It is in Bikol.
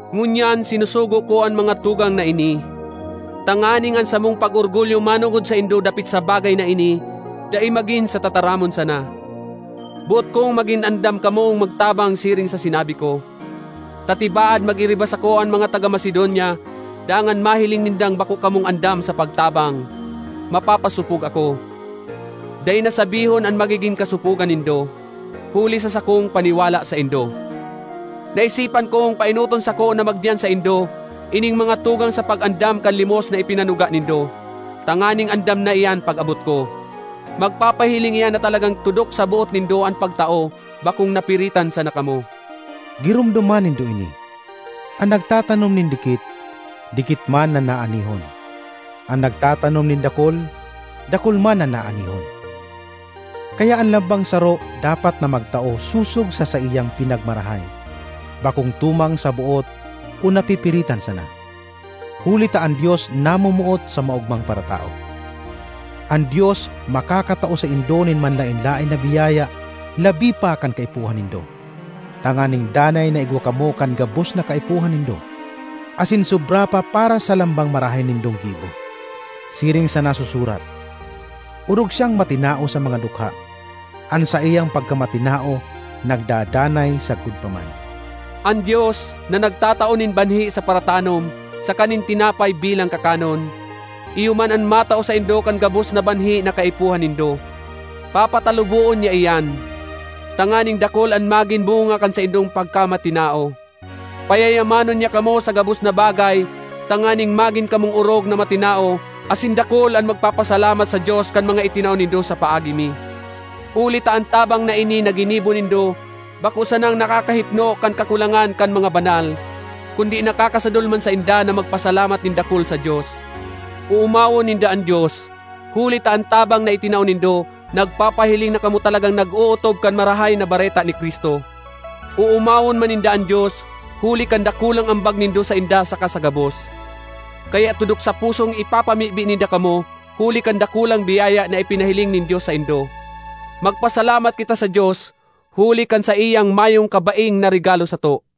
Ngunyan sinusugo ko an mga tugang na ini, tanganing an samong pag-orgulyo manongod saindo dapit sa bagay na ini dai magin sa tataramon sana. Boot kong magin andam kamong magtabang siring sa sinabi ko; ta tibaad mag-iriba sako an mga taga Macedonia dangan mahiling nindang bako kamong andam sa pagtabang, mapapasopog ako—dai na sabihon an magigin kasopogan nindo—huli sa sakong paniwala saindo! Naisipan kong paenoton sako na magdiyan saindo ining mga tugang sa pag-andam kan limos na ipinanuga nindo, tanganing andam na iyan pag-abot ko. Magpapahiling iyan na talagang tudok sa boot nindo an pagtao, bakong napiritan sana kamo. Giromdoma nindo ini: an nagtatanom nin dikit, dikit man an aanihon; an nagtatanom nin dakul, dakul man an aanihon. Kaya an lambang saro dapat na magtao sosog sa saiyang pinagmarahay, bakong tumang sa boot o napipiritan sana, huli ta an Dios namomoot sa maogmang paratao. An Dios makakatao saindo nin manlaen-laen na biyaya labi pa kan kaipuhan nindo, tanganing danay na igwa kamo kan gabos na kaipuhan nindo, asin sobra pa para sa lambang marahay nindong gibo. Siring sa nasusurat, “Orog siyang matinao sa mga dukha; an saiyang pagkamatinao nagdadanay sagkod pa man.” An Dios, na nagtatao nin banhi sa paratanom saka nin tinapay bilang kakanon, iyo man an matao saindo kan gabos na banhi na kaipuhan nindo. Papataluboon niya iyan, tanganing dakul an magin bunga kan saindong pagkamatinao. Payayamanon niya kamo sa gabos na bagay tanganing magin kamong orog na matinao asin dakul an magpapasalamat sa Dios kan mga itinao nindo sa paagi mi. Huli ta an tabang na ini na ginibo nindo bako sanang nakakahipno kan kakulangan kan mga banal, kundi nakakasadol man sainda na magpasalamat nin dakul sa Dios. Oomawon ninda an Dios huli ta an tabang na itinao nindo nagpapahiling na kamo talagang nag-ootob kan Marahay na Bareta ni Cristo. Oomawon man ninda an Dios huli kan dakulang ambag nindo sainda saka sa gabos. Kaya tudok sa pusong ipapamibi ninda kamo huli kan dakulang biyaya na ipinahiling nin Dios saindo. Magpasalamat kita sa Dios huli kan saiyang mayong kabaing na regalo sato!